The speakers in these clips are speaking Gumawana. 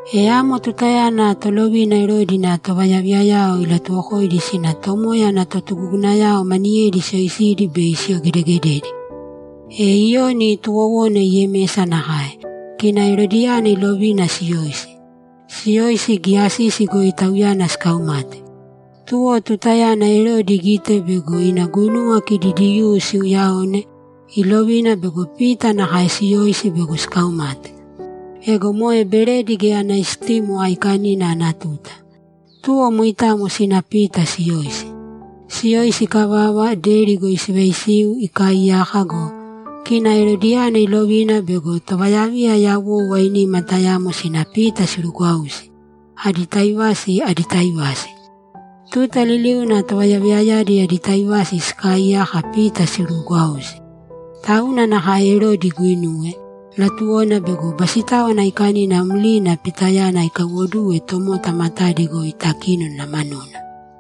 E amo tutayana tolovina Erodi ina tovayaviyayao ilatuwokoidi sina Tomoya ana totugugunayao maniyedi siyoisidi bei siyogedegededi. E Iyoni tuwowona Yemesa nakae, kina Erodiyana ilovina siyoisi. Siyoisi, giya sisi goi tauyana sikaumate. Tuwo tutayana Erodi igite bego ina guinuwa kidi Diyuu siuuyaone, ilovina bego Pita nakae siyoisi bego sikaumate. Ego moe Beredi Geya Ana Istimo Aikanina ana tuta. Tuwo moitamo sina Pita siyoisi. Siyoisi ikavava, deri goi sivaisiu ikaaiyaka go, kina Erodiyana ilovina bego tovayaviya yawou ainima tayamo sina Pita sirugwausi, adi taivasi, adi taivasi. Tuta liliuna tovayaviyayadi adi taivasi sikaaiyaka Pita siruugwausi. Tauna nakae Erodi iguinuwe; latuwona bego Basitáwana Aikanina mlina Pitayana ikaiwoduwe tomota matadi goi takínona manuna.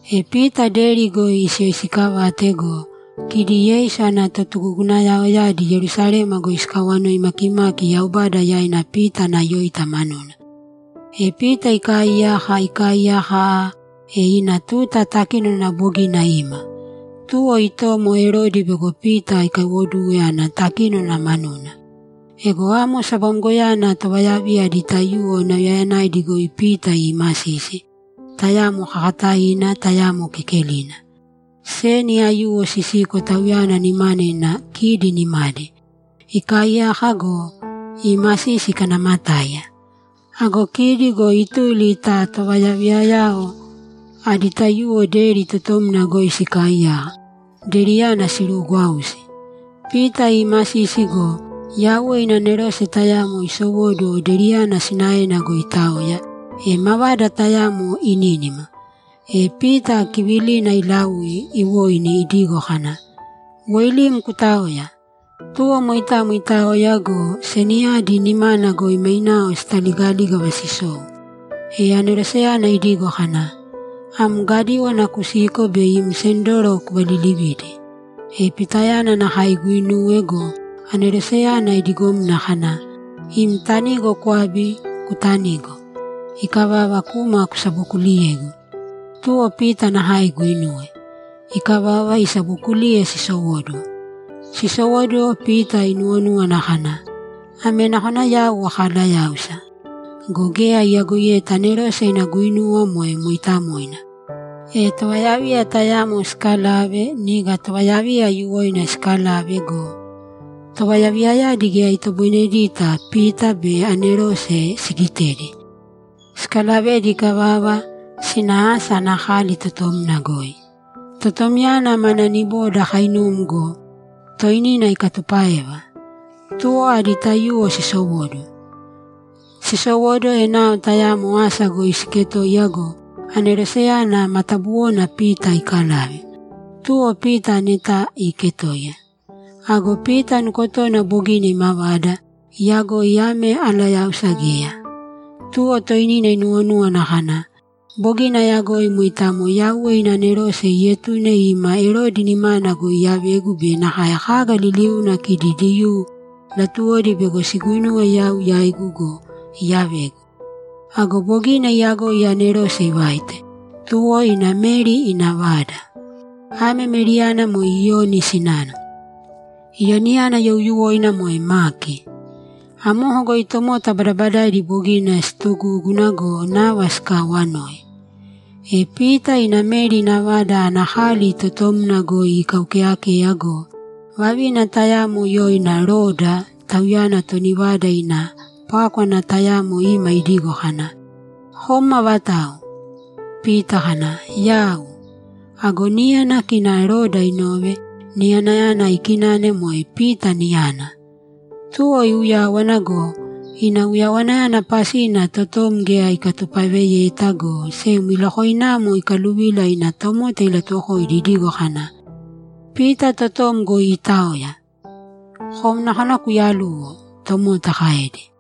E Pita deri goi siyoisiikavate go, kidi Yeisu ana totugugunayaoyadi Yerusalema goi sikaawanoi makimaki Yaubada yaina Pita ana yóita manuna. E Pita ikaaiyaka, ikaaiyaka aaa, e ina tuta takínona bogina ima. Tuwo itomo Erodi bego Pita ikaiwoduwe ana takínona manuna. Ego amo sabamgoyana tovayaviya adi taiyuwo nauyayanaidi goi Pita iimasisi, tayamo kakataina, tayamo kekelina. Seni aiyuwo sisiko tauyana nimana ina kidi nimadi. Ikaaiyaka go, iimasisi ikanamatáiya. Ago kidi go ituli ta tovayaviyayao adi taiyuwo deri totomna goi sikaaiyaka, deriyana siruugwausi. Pita iimasisi go, Yauwe ina anerose tayamo isowóduwo deriyana sinaena goi itaoya, e mavada tayamo inínima. E Pita kivilina ilaui, iwoini idigo kana, ‘Woilīm kutāoya!’ Tuwo moitamo itaoya go, seniyadi nimana goi mainao sitaligalígava sisou. E aneroseyana idigo kana, ‘Am gadíwana kusīko be im sendoro kuvalilivīdi.’ E Pitayana nakae iguinuwe go, aneroseyana idigomna kana, ‘Im tanigo kwābi, kutanīgo. Ikavava, kūma kusabokuliyēgu.’ Tuwo Pita nakae iguinuwe. Ikavava, isabookuliye sisowóduwo. Sisowóduwo, Pita inuwonúwana kana, ‘Ame nakona yau akalayáusa.’ Go geya iyagoiyeta anerose ina guinuwa moe mooitamoina. E tovayaviya tayamo sikalave, niga tovayaviya aiyuwoina sikalave go, tovayaviyayadi geya itoboinedita Pita be anerose sigitedi. Sikalavedi ikavava, sina asa ana kali totomna goi. Totomyana mana niboda kainum go, toinina ikatupáeva. Tuwo adi taiyuwo sisowóduwo. Sisowóduwo, enao tayamo asa goi siiketoiya go, aneroseyana matabuwona Pita ikalave. Tuwo Pita aneta iketoiya. Ago Pita nukotona bogina imavada, iyagoi ame alayáusa geya. Tuwo toinina inuwonúwana kana, ‘Bogina ayagoi moitamo Yauwe ina anerose ietune ima Erodi nimana goi iyavegu be nakae kaga liliuna kidi Diyuu latuwodi bego siguinuwe yau yaigu go, iyavegu.’ Ago bogina iyagoi anerose ivaite, tuwo ina Meri ina vada. Ame Meriyana moe Iyoni sinana. Iyoniyana youyuwoina moe Maki. Amoko goi tomota badabadaidi bogina siitugúguna go, nava sikaawanoi. E Pita ina Meri ina vada ana kali totomna goi ikaukeeyakeya go, vavina tayamo yoina Roda, tauyana toni vada ina pákwana tayamo ima idigo kana, ‘Kom avatau?’ Pita kana, ‘Yau.’ Ago niyana kina Roda inove, niyanayana ikinane moe Pita niyana. Tuwo iuyáwana go, ina uyawanayana pasina totom geya ikatupaeveyeta, go sem ilokoinamo ikaluvila ina tomota ilatuwokoidi idigo kana, ‘Pita totom goi iitaoya!’ ‘Kom nakona kuyaluwo’, tomota kaedi.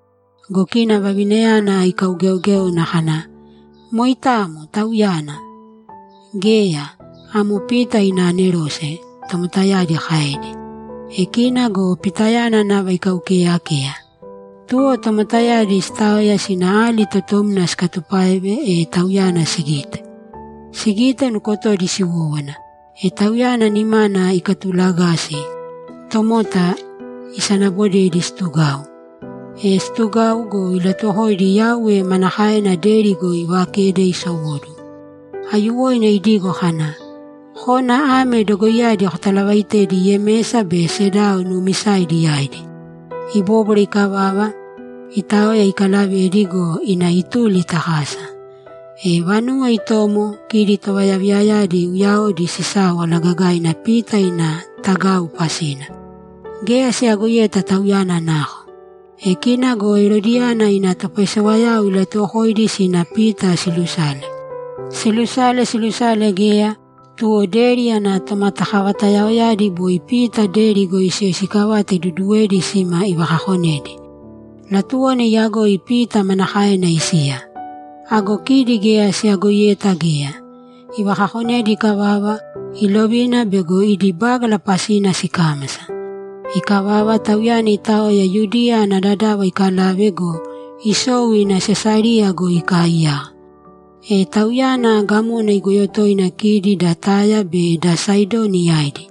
Go kina vavinayana ikaugeogéona kana, ‘Moitamo, tauyana!’ ‘Geya. Amo Pita ina anerose’, tomotayadi kaedi. E kina go Pitayana nava ikaukeeyakeya. Tuwo tomotayadi sitaoya sina ali totomna sikatupáeve, e tauyana sigite. Sigite, nukotodi siwówana. E tauyana nimana ikatulagasi, tomota isanabodedi situgau. E situgau go, ilatuwokoidi Yauwe manakaena deri goi ivakede isowóduwo. Aiyuwoina idigo kana, ‘Kōna ame dogoiyadi kotalavaitēdi Yemesa be sedao nuumisaidi yaidi.’ Ibóbwara ikavava, itaoya ikalavedi go, ina ituli ta kasa. E vanuwo itomo, kidi tovayaviyayadi uyaodi sisáwala gagaina Pita ina tagau pasina. Geya siyagoiyeta tauyana nako. E kina go Erodiyana ina topaisewayao ilatuwokoidi sina Pita silusale. Silusale, silusale, geya, tuwo deri ana tomatakavatayaoyadi boi Pita deri goi siyoisiikavate iduduwedi sima ivakakonedi. Latuwona iyagoi Pita manakaena isiya. Ago kidi geya siyagoiyeta geya. Ivakakonedi ikavava, ilovina bego idi bágala pasina sikámasa. Ikavava, tauyana itaoya Yudiya ana dadava ikalave go, isou ina Sesariya goi ikaaiyaka. E tauyana gamona igoyo toina kidi da Taya be da Saidoni yaidi.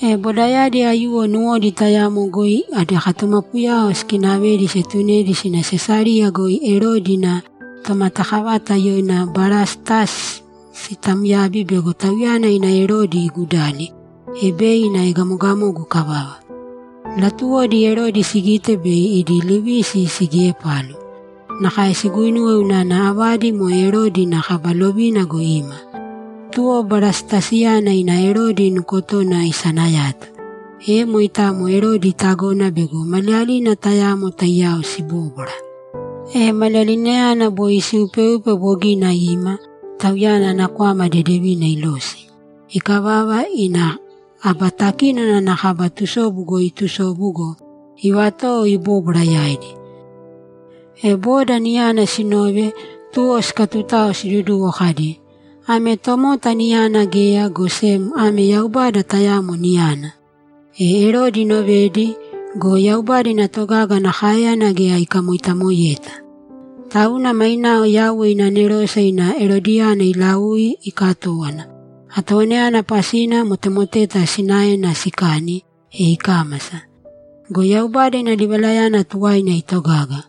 E bodayadi aiyuwo nuwodi tayamo goi adi katumapuyao sikinavedi sietunedi sina Sesariya goi Erodi ina tomatakavata yoina Barastasi sitamyabi bego tauyana ina Erodi igudali, e bei ina egamogamogu ikavava. Latuwodi Erodi sigite bei idi livisi sigiepalu. Nakae siguinuwe unana avadi moe Erodi ina kaba lovina goi ima. Tuwo Barastasiyana ina Erodi nukotona isanayato. E moitamo Erodi itagona bego maliyalina tayamo taiyao sibóbwara. E maliyalinayana boi siupeupe bogina ima, tauyana ana kwama dedevina ilosi. Ikavava, ina aba takínona ana kaba tusobu goi itusobu go, ivatowo ibóbwara yaidi. E boda niyana sinove, tuwo sikatutao siduduwo kadi, ‘Ame tomota niyana geya, go sem ame yaubada tayamo niyana!’ E Erodi inovedi go, Yaubada ina togaga ana káeyana geya ikamoitamoeyeta. Tauna mainao Yauwe ina anerose ina Erodiyana ilaui ikatówana; atowanayana pasina motemoteta sinaena sikani, e ikámasa. Go Yaubada ina livalayana tuwaina itogaga.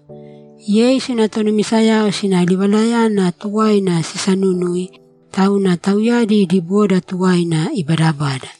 Yeisu ina tonumisayao sina livalayana tuwaina sisanunui, tauna tauyadi idi boda tuwaina ibadabada.